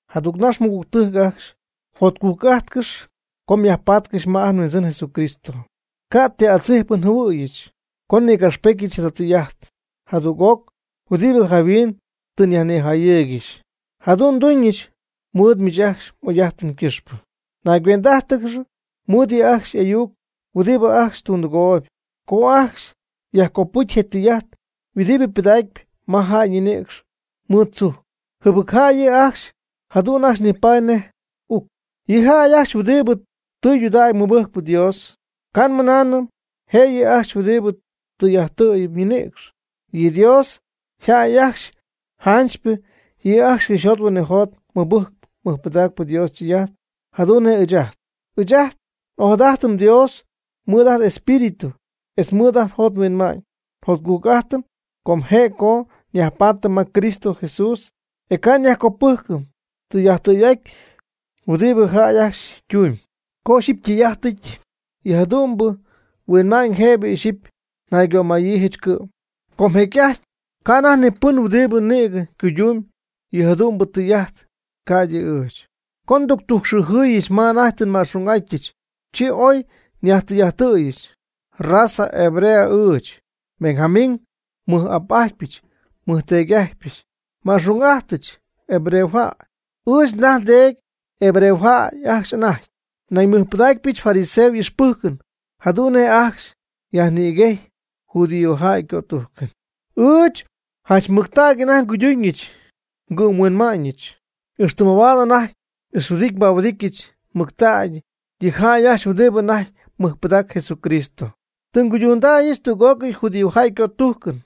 Jadügnax, mɨgügtɨjc ajcxy, jotcujc'ajtcɨx co myajpatcɨxy ma ajt nHuindzɨn Jesucristo. Ca' ti adzijpɨn njɨhuɨ̈yɨch co nnïgapxpetyɨch jada tɨy'ajt jadüg'oc huɨdibɨ jayhuin tɨ nyajnijayɨɨygɨxy. Jadu'n nduñɨch mɨɨd miich ajcxy m'oy'ajtɨn ycɨxpɨ. Naygüendɨ'ájtɨgɨx mɨɨd yɨ' ajcxy y'ayuc huɨdibɨ ajcxy tundɨgooyb co ajcxy yajcopɨjcy yɨ tɨy'ajt huɨdibɨ pɨdacp ma jäy ñinïcx mɨɨd tzujc. Jɨbɨc jäy yɨ' ajcxy, jadu'n ajcxy nipaady nej uc. Yɨ jäy ajcxy huɨdibɨ tɨydudägy mɨbɨjcp Dios, ca' nmɨnaanɨm je' yɨ' ajcxy huɨdibɨ tɨy'ajttɨ̈yɨp ñinïcx. Yɨ Dios yjäy ajcxy janchypɨ, yɨ' ajcxy cɨxyjot huinɨjot mɨbɨjcp mɨjpɨdacp Dios ytɨy'ajt jadu'n nej ɨɨch ajt. Ɨɨch ajt n'ojadajtɨm Dios mɨɨd ajt n'espíritu, etz mɨɨd ajt njot nhuinma'ñ. Jotcujc'ajtɨm com je' co nyajpaatɨm ma Cristo Jesús, e ca' nyajcopɨjcɨm tijaty tɨy'ajt huɨdibɨ jäy ajcxy ytumyb. Co ixyipy ytɨy'ajtɨty yɨ jadu'mbɨ huinma'ñ, jëbɨ ixyipy naygömayiijɨch cɨ'm, com jecy'ajty ca' anajty ni pɨn huɨdibɨ nïgɨ cuyduun yɨ jadu'mbɨ tɨy'ajt ca'ydɨ ɨɨch. Co nductujcxɨɨjɨ̈yɨch ma anajty tɨ nma'xung'atyɨch, chi oy nyajtɨy'ajttɨ̈yɨch. Raza hebrea ɨɨch, Benjamín nmɨj'ap'ajtpyɨch nmɨjteedy'ajtpyɨch. Nma'xung'ajtɨch hebreojäy. Ɨɨch ndaj ndeedy hebreojäy ajcxy anajty. Nañ nmɨjpɨdaacɨch fariseo y'ixpɨjcɨn, jadu'n nej ajcxy yajnïguejy judíojäy ycötujcɨn. Ɨɨch janchmɨctägy anajty nguyduñɨch ngɨ'mhuinma'ñɨch, ixtɨ mabaad anajty n'ixhuɨdity nbahuɨdityɨch mɨctägy yɨ jäy ajcxy huɨdibɨ anajty mɨjpɨdacp Jesucristo. Tɨ nguydundäyɨch tüg'ócɨy judíojäy ycötujcɨn.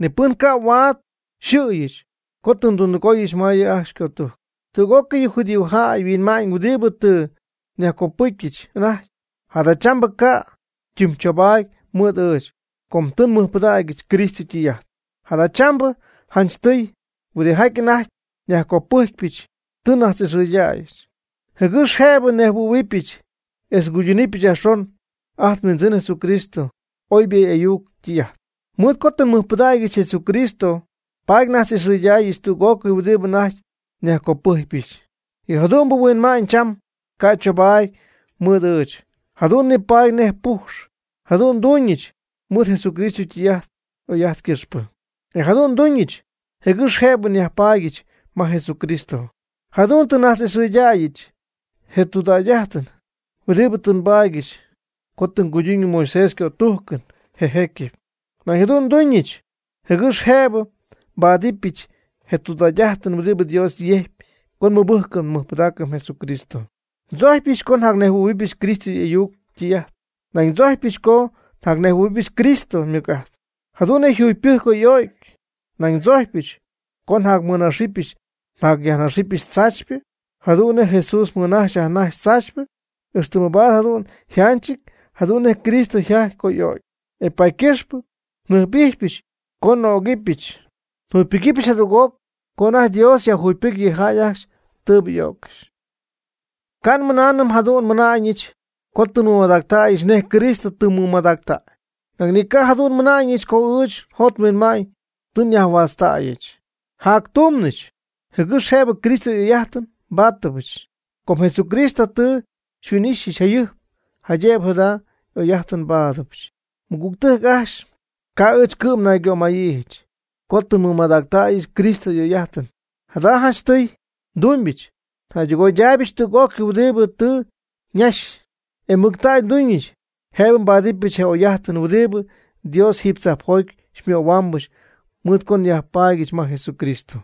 Ni pɨn ca' huaad yxɨ̈yɨch co tɨ ndundɨgooyɨch ma yɨ' ajcxy ycötujcɨn. Tüg'ócɨy yɨ judíojäy yhuinma'ñ huɨdibɨ tɨ nyajcopɨcyɨch anajty, jadachambɨ ca' ytimychobaady mɨɨd ɨɨch, co tɨ nmɨjpɨdägyɨch Cristo ytɨy'ajt. Jadachambɨ janchtɨy, huɨdijaty anajty nyajcopɨjcpyɨch, tɨ nnajtz'ixɨɨydäyɨch, jɨgɨx jëbɨ nnejhuɨ̈huɨbɨch etz nguydunɨpɨch yajxon ajt nHuindzɨn Jesucristo oybɨ y'ayuc ytɨy'ajt. Mɨɨd co tɨ nmɨjpɨdägyɨch Jesucristo, paady nnajtz'ixɨɨydaayɨch tüg'ócɨy huɨdibɨ anajty nyajcopɨjcpyɨch, yɨ jadu'mbɨ huinma'ñ cham ca' chobaady mɨɨd ɨɨch, jadu'n nipaady nej püx. Jadu'n nduuñɨch mɨɨd Jesucristo ytɨy'ajt oy'ajt ycɨxpɨ. E jadu'n nduuñɨch jɨgɨx jëbɨ nyajpaadyɨch ma Jesucristo. Jadu'n tɨ nnajtz'ixɨɨydäyɨch je tudägy'ajtɨn huɨdibɨ tɨ nbaadyɨch co tɨ nguyduuñɨch Moisés ycötujcɨn je jecyɨp. Nañ jadu'n nduñɨch jɨgɨx jëbɨ nbáadɨbɨch je tudägy'ajtɨn huɨdibɨ Dios yejcpy co nmɨbɨjcɨm nmɨjpɨdaacɨm Jesucristo. Ndzojcpyɨch co njacnejhuɨ̈huɨbɨch Cristo y'ayuc ytɨy'ajt. Nañ ndzojcpyɨch co njacnejhuɨ̈huɨbɨch Cristo ymɨc'ajt, jadu'n nej yjugypɨjcy co y'o'cy. Nañ ndzojcpyɨch co njacmɨnaxɨpyɨch njacyajnaxɨpyɨch tzaachypɨ jadu'n nej Jesús mɨnaxy yajnaxy tzaachypɨ, ixtɨ mabaad jadu'n njatyɨch jadu'n nej Cristo yjajty co y'o'cy. E paady ycɨxpɨ njɨjp'ijxpyɨch co n'ögɨbɨch njugypɨgɨpyɨch jadüg'oc co anajty Dios yajjugypɨcy yɨ jäy ajcxy tɨɨbɨ y'öccɨxy. Ca' nmɨnaanɨm jadu'n nmɨna'ñɨch co tɨ nmɨmadactäyɨch nej Cristo tɨ mɨmadactäy. Nañ ni ca' jadu'n nmɨna'ñɨch co ɨɨch njot nhuinma'ñ tɨ nyajhuätztäyɨch. Njactumnɨch, jɨgɨx jëbɨ Cristo y'oy'ajtɨn nbáadɨbɨch. Com Jesucristo tɨ xyhuin'ixyɨch jayɨjp, jaydëbɨ jada oy'ajtɨn nbáadɨbɨch. Mɨgügtɨjc ajcxy, ca'ɨɨch cɨ'm naygömayiijɨch, co tɨ nmɨmadactäyɨch Cristo y'oy'ajtɨn. Jada janchtɨy ndumbyɨch, njäydɨgoydaaybɨch tüg'ócɨy huɨdibɨ tɨ ñaxy, e mɨctägy nduuñɨch jëbɨ nbáadɨbɨch je oy'ajtɨn huɨdibɨ Dios jiiby tzajpjoty xymöhuaambɨch mɨɨd co nyajpaadyɨch ma Jesucristo.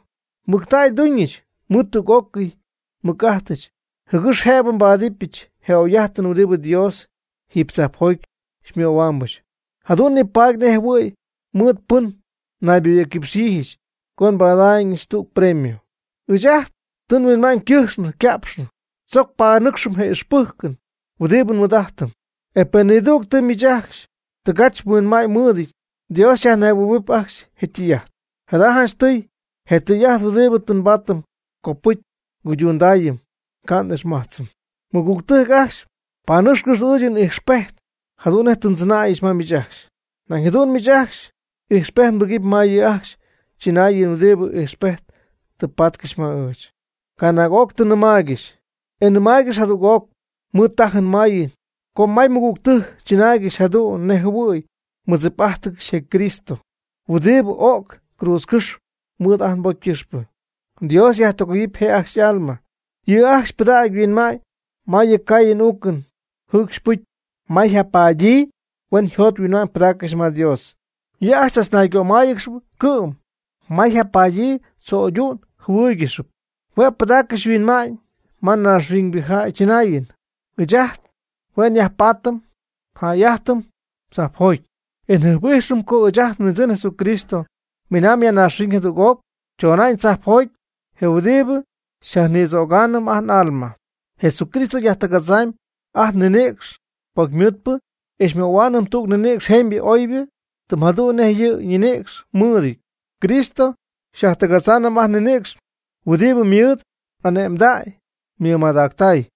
Mɨctägy nduuñɨch mɨɨd tüg'ócɨy nmɨc'ajtɨch, jɨgɨx jëbɨ nbáadɨbɨch je oy'ajtɨn huɨdibɨ Dios jiiby tzajpjoty xymöhuaambɨch. Jadu'n nipaady nejɨhuɨ̈y mɨɨd pɨn nayboyɨ̈cquipxyiijɨch co nbada'ñɨch tüg premio. Ɨɨch ajt tɨ nhuinma'ñ ycɨjxnɨ yca'pxnɨ, tzoc panɨcxɨm je ixpɨjcɨn huɨdibɨ nmɨɨd'ajtɨm. E pen nidügtɨ miich ajcxy tɨgachjaty huinma'ñ mɨɨdɨty, Dios xyajnejhuɨ̈huɨp ajcxy je tɨy'ajt. Jada janchtɨy, je tɨy'ajt huɨdibɨ tɨ nbaatɨm copɨcy nguydundaayɨm, ca' n'ixmajtzɨm. Mɨgügtɨjc ajcxy, panɨcxcɨx ɨɨch n'ijxpejt jadu'n nej tɨ ndzɨnäyɨch ma miich ajcxy. Nañ jadu'n miich ajcxy ijxpejt mbɨgɨpy ma yɨ' ajcxy chɨnaayɨn huɨdibɨ ijxpejt tɨ patcɨxy ma ɨɨch. Canaag'oc tɨ nnɨmaaygɨxy, e nnɨmaaygɨxy jadüg'oc mɨɨd tajɨn mayɨn co may nmɨgügtɨjc chɨnaaygɨxy jadu'n nej jɨhuɨ̈y mɨdzip'ajtcɨxy je Cristo huɨdibɨ o'c cruudzcɨ́xy mɨɨd ajt nbocy ycɨxpɨ. Dios yajtɨgoyɨp je'ajcxy y'alma. Yɨ' ajcxy ypɨdacpy yhuinma'ñ ma yɨ caayɨn uucɨn jɨɨcxy ypɨcy, ma yjapadyii huen yjot yhuinma'ñ pɨdaaccɨxy ma Dios. Yɨ' ajcxy chachñaygömáayɨgɨxy cɨ'm ma yjapadyii tzo'ydu'n jɨhuɨ́ɨyɨgɨxɨpy. Hue' pɨdaaccɨxy yhuinma'ñ ma naaxhuiñ jäy chɨnaayɨn. Ɨɨch ajt hue' nyajpaatɨm njäy'ajtɨm tzajpjoty, e njɨjp'ijxɨm co ɨɨch ajt nHuindzɨn Jesucristo miinaamb ya naaxhuiñ jadüg'oc, chona'ñ tzajpjoty, je huɨdibɨ xyajnïdzögaanɨm ajt n'alma. Jesucristo xyajtɨgadzaanɨm ajt nninïcx pocymɨɨdpɨ, e xymöhuaanɨm tüg ninïcx jemybɨ oybɨ, tɨm jadu'n nej yɨ' ñinïcx mɨɨdɨty. Cristo xyajtɨgadzaanɨm ajt nninïcx mɨɨd yɨ' ymɨc'ajt huɨdibɨ mɨɨd ane'mdäy mɨmadactäy.